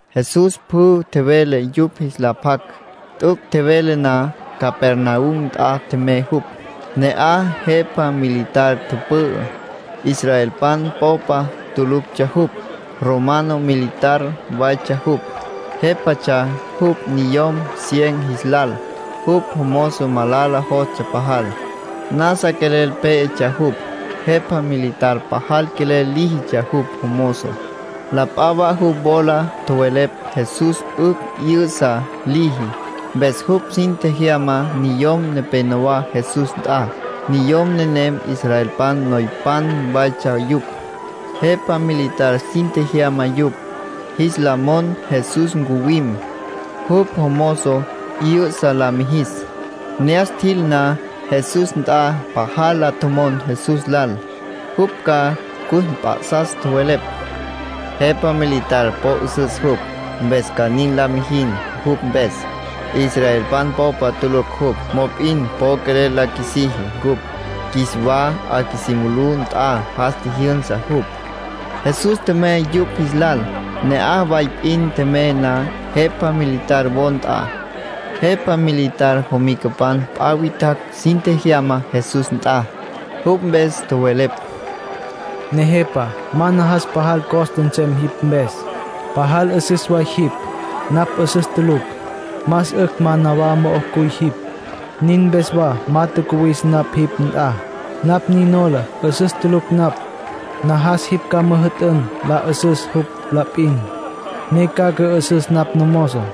Jesús pjü tjevele yupj jis la pjac. T'üc' tjevele na, Capernaum nt'a tjemey jupj. Ne'aj jepa militar tüpü'ü. Israelpan popa tuluctsja jupj. Romano militar waytsja jupj. Jépatsja jupj niyom cien jis lal. Jupj mozo malala jostsja pajal, nasa quelel pé'etsja jupj. Jepa militar pajal quelel líjitsja jupj jomozo. La p'a wa jupj wola tjowelepj Jesús 'ücj 'yü'sa liji. Mpes jupj sin tjejyama niyom nepénowa Jesús nt'a. Niyom nenem israelpan noypan waytsja yupj. Jepa militar sin tjejyama yupj, jis la mon Jesús ncuwim, jupj jomozo 'yü'sa la mijis. Ne'as tjil na Jesús nt'a, pajal la tjomon Jesús lal, jupj ca cus mp'a'sas. Tjowelepj: —Jepa militar po 'üsüs jupj, mpes ca nin la mijin jupj mpes. Israelpan popa tulucj jupj, mop'in po quelel la qjuisiji cupj. Qjuis wa 'a qjuisí mulú nt'a jas tjijyünsa jupj. Jesús tjemey yupj jis lal. Ne'aj way p'in tjemey na, jepa militar wo nt'a, jepa militar jomicapan p'a witjacj sin tjejyama Jesús nt'a. Jupj mpes tjowelepj: —Nejepa, ma najas pajal costa nsem jipj mpes. Pajal 'üsüs way jipj. Napj 'üsüs tulucj. Más 'ücj ma nawá mo'ó cuy jipj. Nin mpes wa ma tjacuwis napj jipj nt'a. Napj nin nola 'üsüs tulucj napj. Najas jipj ca müjü'tün la 'ü'süs jupj la p'in, ne ca cü'ü'süs napj namozo.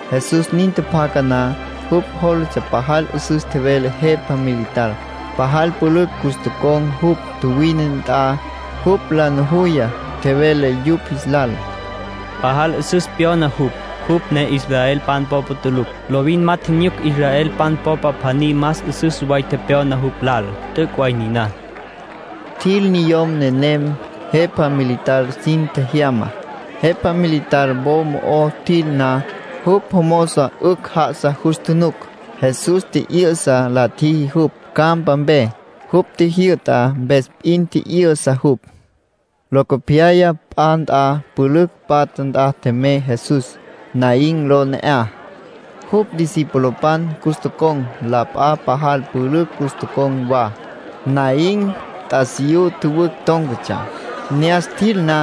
Jesús nin tjapjaca na, jupj jólatsja pajal 'üsüs tjevele jepa militar. Pajal pülücj cus tocon̈ jupj tjuwine nt'a. Jupj la nujuya, tjevele yupj jis lal: —Pajal 'üsüs pyona jupj, jupj ne israelpan popa tulucj. Lovin ma tjinyuc israelpan popa pjaní más 'üsüs way tepyona jupj lal. T'üc' way niná —tjevele Jesús. Tjil niyom nenem jepa militar sin tjejyamá. Jepa militar wo mo'ó tjil na, jupj jomozo 'ücj já'asa jus tjunuc. Jesús tji'yü'sa la tjiji jupj campa mpe. Jupj tjijyü'ta mpes p'in tji'yü'sa jupj. Locopyaya p'a nt'a pülücj patja nt'a tjemey Jesús. Naín ló ne'aj. Jupj discipulopan cus tocon̈, la p'a pajal pülücj cus tocon̈ wa. Naín t'asiyú tjüwücj tón̈catsja. Ne'as tjil na,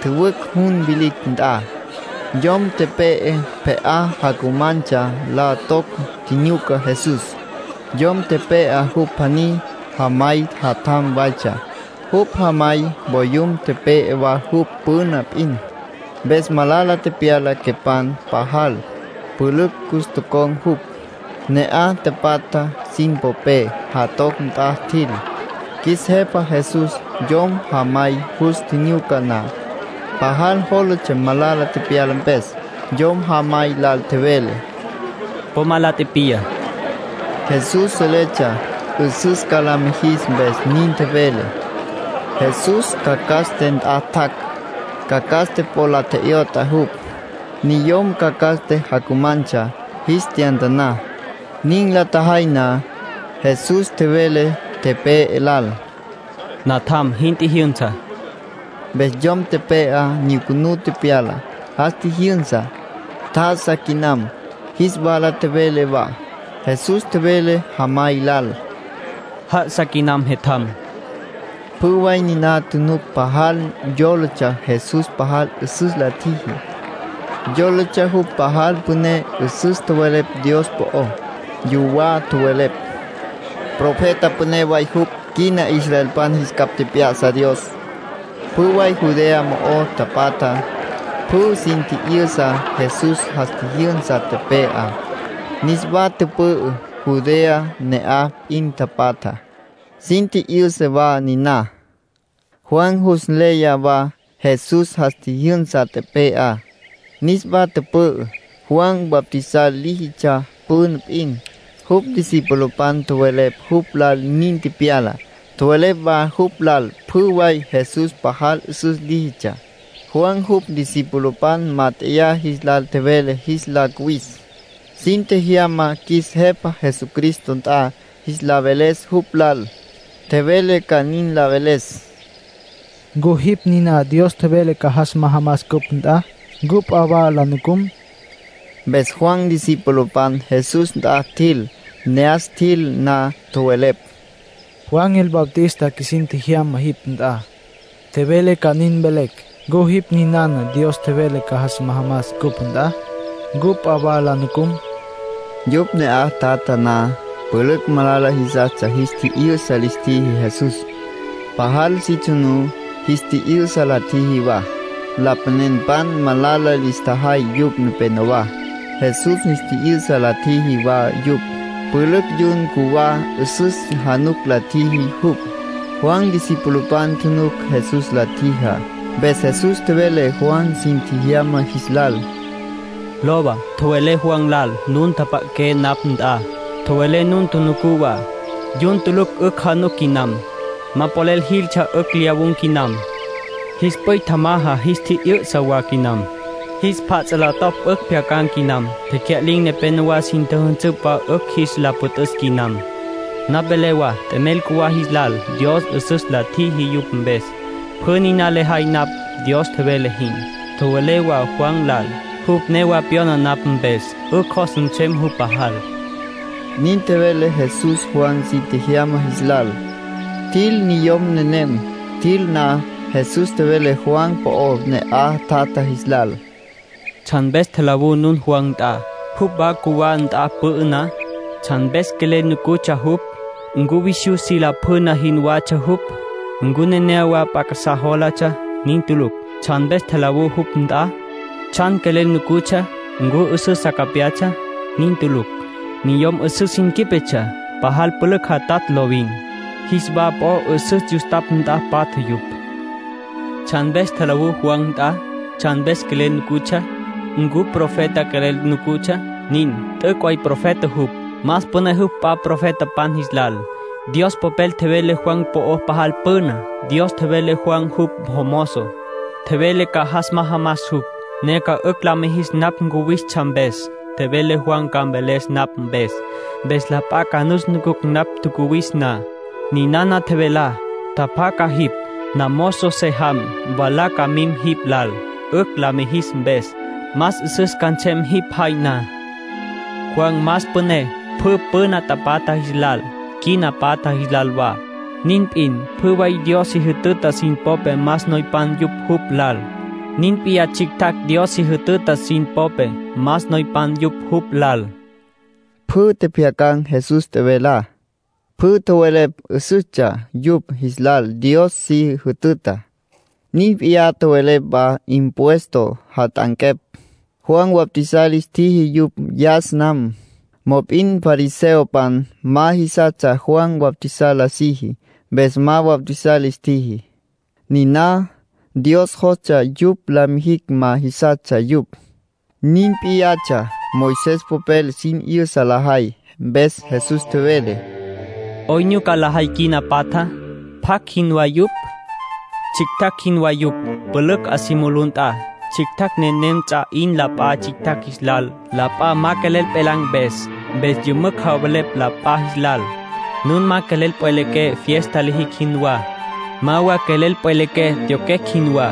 tjüwücj jun vilicj nt'a, yom tepe'e pje'á jacumantsja la toc tjinyuca Jesús. Yom tepe'á, jupj pjaní jamay jatjam waytsja. Jupj jamay voyum tepe'e wa jupj püna p'in, mpes malala tepyala quepan pajal. Pülücj cus tocon̈ jupj, ne'aj tapatjá sin popé. Jatoc nt'a tjil. Qjuis Jepa Jesús yom jamay jus tjinyuca na, pajal jólatsja malala tepyala mpes. Yom jamay lal tjevele: —Po ma la tipiya. (Jesús seletsja 'üsüs ca la mijis, mpes nin tjevele.) Jesús cacaste nt'a tjac', cacaste po la tje'yot'a jupj. Niyom cacaste jacumantsja jis tyantaná. Nin la tjajay na, Jesús tjevele tepe'e lal: —Natjam, jin tjijyünsa. Mpes yom tepe'á nyucunú tepyala. Jas tjijyünsa, tjá'asa quinam, jis wala tjevele wa. Jesús tjevele jamay lal: —Já'asa quinam jetjam. Pjü way niná tjunuc pajal yólatsja Jesús pajal 'üsüs la tjiji, yólatsja jupj pajal püné. 'Üsüs tjowelepj Dios po'ó. Yuwá tjowelepj: “Profeta püné way jupj. Quina israelpan jis capj tjep'ya'sa Dios.” Pjü way Judea mo'o tapatja, pjü sin tji'yüsa Jesús jas tjijyünsa tepe'á, niswa tüpü'ü. Judea ne'aj p'in tapatja, sin tji'yüsa wa niná. Juan jus nleya wa Jesús jas tjijyünsa tepe'á, niswa tüpü'ü. Juan bautizar líjitsja püna p'in. Jupj discipulopan tjowelepj jupj lal nin tepyalá. Tjowelepj wa jupj lal pjü way Jesús pajal 'üsüs líjitsja. Juan jupj discipulopan mát'eya jis lal tjevele jis la cuwis, sin tjejyama qjuis Jepa Jesucristo nt'a jis la veles jupj lal. Tjevele ca nin la veles: “¿Ncu jipj ninana Dios tjevele ca jas majamas cupj nt'a? ¿Ncu p'a wa la nucum?” Mpes Juan discipulopan Jesús nt'a tjil. Ne'as tjil na, tjowelepj: —Juan el Bautista qjuisin tjejyama jipj nt'a. Tjevele ca nin mvelecj: ¿Ncu jipj ninana Dios tjevele ca jas majamas cupj nt'a? ¿Ncu p'a wa la nucum? Yupj ne'aj tjatja na, pülücj malala jisas jis tji'yü'sa lis tjiji Jesús. Pajal si tsjunú, jis tji'yü'sa la tjiji wa. Lapanenpan malala lis tjajay yupj nepenowá. Jesús jis tji'yü'sa la tjiji wa yupj. Pülücj yun cjuwá 'üsüs januc la tjiji jupj. Juan discipulopan tjunuc Jesús la tjijá. Mpes Jesús tjevele Juan sin tjejyama jis lal: —Lowa, tjowelé Juan lal nun tjapja'aqué napj nt'a, tjowelé nun tjunucú wa. Yun tulucj 'ücj januc quinam. Ma polel jiltsja 'ücj lyawun̈ quinam. Jis p'üy tjamaja jis tji'yü'sa wa quinam. Jis pjats' la topj 'ücj pjyacan̈ quinam. Tecya'lin̈ nepenowá sin tjüjünsüpj wa 'ücj jis la püt'üs quinam. Napj velé wa t'emel cjuwá jis lal Dios 'üsüs la tjiji yupj mpes. Pjü niná lejay napj, Dios tjevele jin. Tjowelé wa Juan lal: jupj newa pyona napj mpes, 'ücj jos nsem jupj pajal —nin tjevele Jesús Juan sin tjejyama jis lal. Tjil niyom nenem. Tjil na, Jesús tjevele Juan po'ó ne'aj tjatja jis lal. “¿Tsjan mpes tjalawú nun Juan nt'a, jupj wa cjuwá nt'a tüpü'ü na? ¿Tsjan mpes quelel nucutsja jupj? ¿Ncu visyú si lapjüna jinwatsja jupj? ¿Ncu nenéyawa p'a casá jólatsja? Nin tulucj. ¿Tsjan mpes tjalawú jupj nt'a? ¿Tsjan quelel nucutsja? ¿Ncu 'üsüs sa capyatsja? Nin tulucj. Niyom 'üsüs sin quípetsja pajal pülücj jatatj lovin. Jis wa po 'üsüs yustapj nt'a patja yupj. ¿Tsjan mpes tjalawú Juan nt'a? ¿Tsjan quelel nucutsja? ¿Ncu profeta quelel nucutsja? Nin. T'üc' way profeta jupj. Más püné jupj p'a profetapan jis lal. Dios Popel tjevele Juan po'ó pajal püna. Dios tjevele Juan jupj jomozo. Tjevele ca jas majamas jupj, ne ca 'ücj la mijis napj cuwistsja mpes. Tjevele Juan ca mveles napj mpes, mpes la p'a ca nus nucucj napj tjacuwis na. Ninana tjevelá: ‘Tjapjaca jipj. Namozo se jam, mwalá ca mim jipj lal. 'Ücj la mijis mpes, más 'üsüs ca nsem jipj jay na.’ Juan más püné pjü püna tapatja jis lal, quina patja jis lal wa. Nin p'in, pjü way Dios si jütüta sin popé más noypan yupj jupj lal. Nin p'iyá tsjictjacj Dios si jütüta sin popé, más noypan yupj jupj lal”, tjevele Jesús. (Pjü tjepjyacan̈ Jesús tjevelá, pjü tjowelepj 'üsüstsja yupj jis lal Dios si jütütá. Nin p'iyá tjowelepj wa impuesto jat'anquepj. Juan bautizar lis tjiji yupj yas nam. Mop'in fariseopan ma jisastsja Juan bautizar la siji, mpes ma bautizar lis tjiji. Niná Dios jostsja yupj la mijicj ma jisastsja yupj. Nin p'iyatsja Moisés popel sin 'yüsa lajay.) Mpes Jesús tjevele: “¿'Oyn nyuca lajay quina patjá? ¿Pjacj jinwá yupj? Tsjictjacj jinwá yupj, pülücj 'a si mulú nt'a. Tsjictjacj nenem ts'a 'in la p'a tsjictjacj jis lal, la p'a ma quelel pjelan̈ mpes. Mpes yümücj javelepj la p'a jis lal: ‘Nun ma quelel pjwelequé fiesta lijicj jinwá. Ma wa quelel pjwelequé tyoquecj jinwá.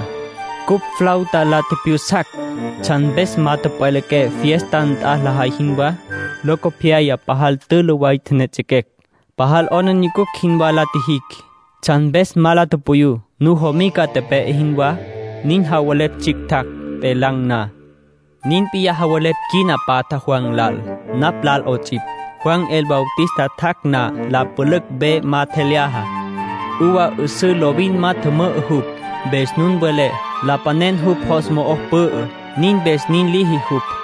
Cupj flauta la tjipjyusacj. ¿Tsjan mpes ma tjüpjwelequé, fiesta nt'a lajay jinwá? Locopyaya pajal tülü way tjenejets'equecj. Pajal 'aplijila jinwá la tjijicj. ¿Tsjan mpes ma la tupuyú, nujamica tepe'e jinwá?’ Nin javelepj tsjictjacj, pjelan̈ na. ”Nin p'iyá javelepj quina patjá Juan lal, napj lal 'ots'ipj. Juan el Bautista tjac' na, la pülücj ve ma tjelyaja. Uva 'üsǘ lovin ma tjümü'ü jupj. Mpes nun welé: ‘Lapanen jupj jos mo'o pü'ü. Nin mpes nin liji jupj.’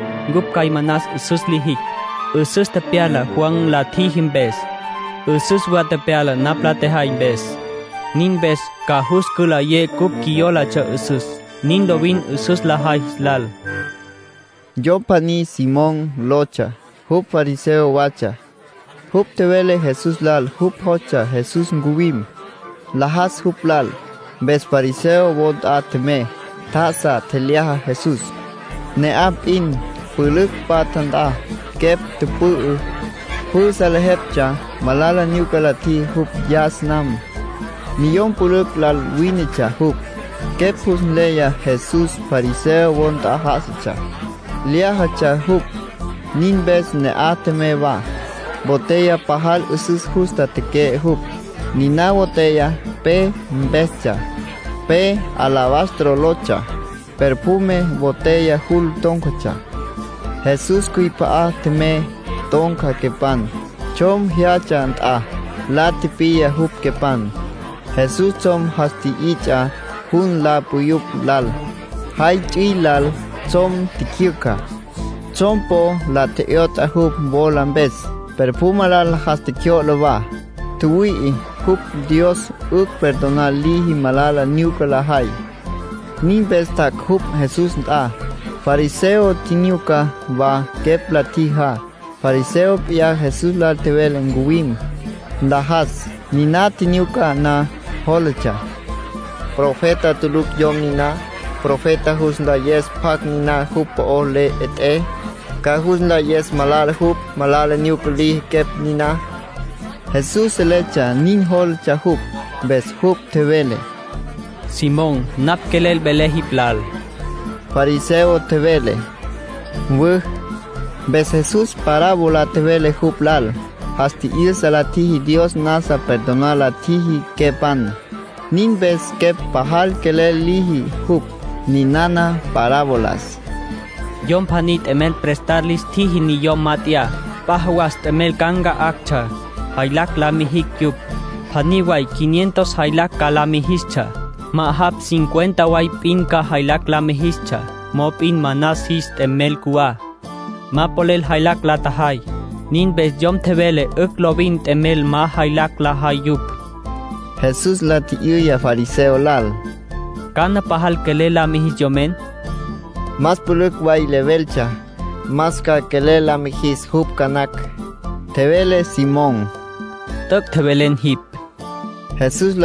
Cupj cjay manas 'üsüs lijicj. 'Üsüs tepyala Juan la tjiji mpes. 'Üsüs wa tepyala napj la tjejay mpes. Nin mpes ca jus cülayé cupj qjuiyólatsja 'üsüs. Nin lovin 'üsüs lajay jis lal”, tjevele Jesús. Yom pjaní Simón lotsja. Jupj fariseo watsja. Jupj tjevele Jesús lal jupj jostsja Jesús ncuwim, nlajas jupj lal. Mpes fariseo wo nt'a tjemey. Tjá'asa, tjelyaja Jesús. Ne'aj p'in, pülücj patja nt'a, quepj tüpü'ü. Pjü salejeptsja malala nyuca la tjiji jupj yas nam. Niyom pülücj lal wínetsja jupj. Quepj jus nleya Jesús fariseo wo nt'a já'asatsja, lyájatsja jupj. Nin mpes ne'aj tjemey wa. Botella pajal 'üsüs justa teque'e jupj. Niná botella pe mpestsja, pe alabastro lotsja. Perfume botella jul tón̈catsja. Jesús cjüip'a'a tjemey, ton̈ca quepan, tsjom jyatsja nt'a. La tipiya jupj, quepan. Jesús tsjom jas tji'its'a jun la puyupj lal. Jay ts'üil lal tsjom tjicjyücja. Tsjom po la tje'yot'a jupj wola mpes. Perfume lal jas tjecjyo'la wa. Tjüwüi'i jupj Dios 'ücj perdonar liji malala nyuca lajay. Nin mpes tjac' jupj Jesús nt'a. Fariseo tjinyuca wa quepj la tjijá. Fariseo p'iyá Jesús lal tjevele ncuwim, nlajas. Niná tjinyuca na, jólatsja: “Profeta tulucj yom niná. Profeta ca jus nlayes pjacj niná jupj po le 'et'é. Ca jus nlayes malala jupj. Malala nyuca liji quepj niná.” Jesús seletsja nin jólatsja jupj, mpes jupj tjevele: —Simón, napj quelel velé jipj lal. Fariseo tjevele: —Mwü. Mpes Jesús parábola tjevele jupj lal. Jas tji'yüsa la tjiji Dios nasa perdonar la tjiji quepan. Nin mpes quepj pajal quelel liji jupj. Ninana parabolas: —Yom pjaní t'emel prestar lis tjiji niyom mat'eyá, p'a jawas t'emel ca nca'actsja, jaylacj la mijictsja yupj. Pjaní way quinientos jaylacj ca la mijistsja, ma'ajapj cincuenta way p'in ca jaylacj la mijistsja. Mop'in manas jis t'emel cjuwá. Ma polel jaylacj la tjajay. Nin mpes yom tjevele 'ücj lovin t'emel ma jaylacj lajay yupj. Jesús la tji'yüya fariseo lal: —¿Cana pajal quelel la mijis yomen? —Más pülücj way leveltsja, más ca quelel la mijis jupj ca nacj —tjevele Simón. —T'üc' tjevelen jipj —tjevele Jesús.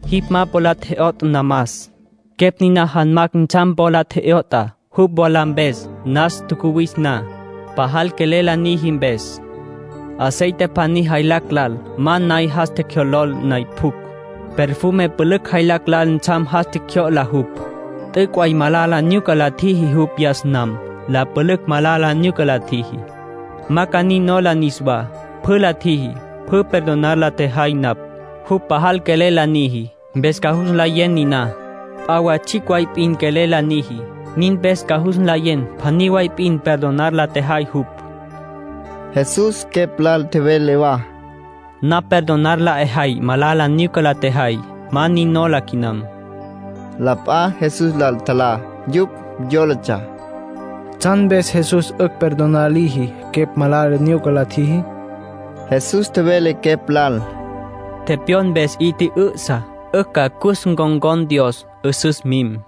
Jipj ma po la tje'yotj namas. Quepj niná janmacj ntsjam po la tje'yot'a jupj wola mpes nas tjacuwis na, pajal quelel la niji mpes. Aceite pjaní jaylacj lal ma nay jas tjecjyolol nay pjucj. Perfume pülücj jaylacj lal ntsjam jas tjecjyo'la jupj. T'üc' way malala nyuca la tjiji jupj yas nam, la pülücj malala nyuca la tjiji. Ma ca nin nola niswá. Pjü la tjiji, pjü perdonar la tjejay napj. Jupj pajal quelel la niji, mpes ca jus nlayen niná. P'a wa tsjicj way p'in quelel la niji. Nin mpes ca jus nlayen pjaní way p'in perdonar la tjejay jupj. Jesús quepj lal tjevele wa: —Napj perdonar la 'ejay malala nyuca la tjejay. Ma nin nola quinam. La p'a Jesús lal tjalá. Yupj yólatsja: “¿Tsjan mpes Jesús 'ücj perdonar liji quepj malala nyuca la tjiji?” Jesús tjevele quepj lal: —Tepyon mpes 'i tjü'ü'sa, 'ücj ca cus ncon̈con Dios. 'Üsüs mim.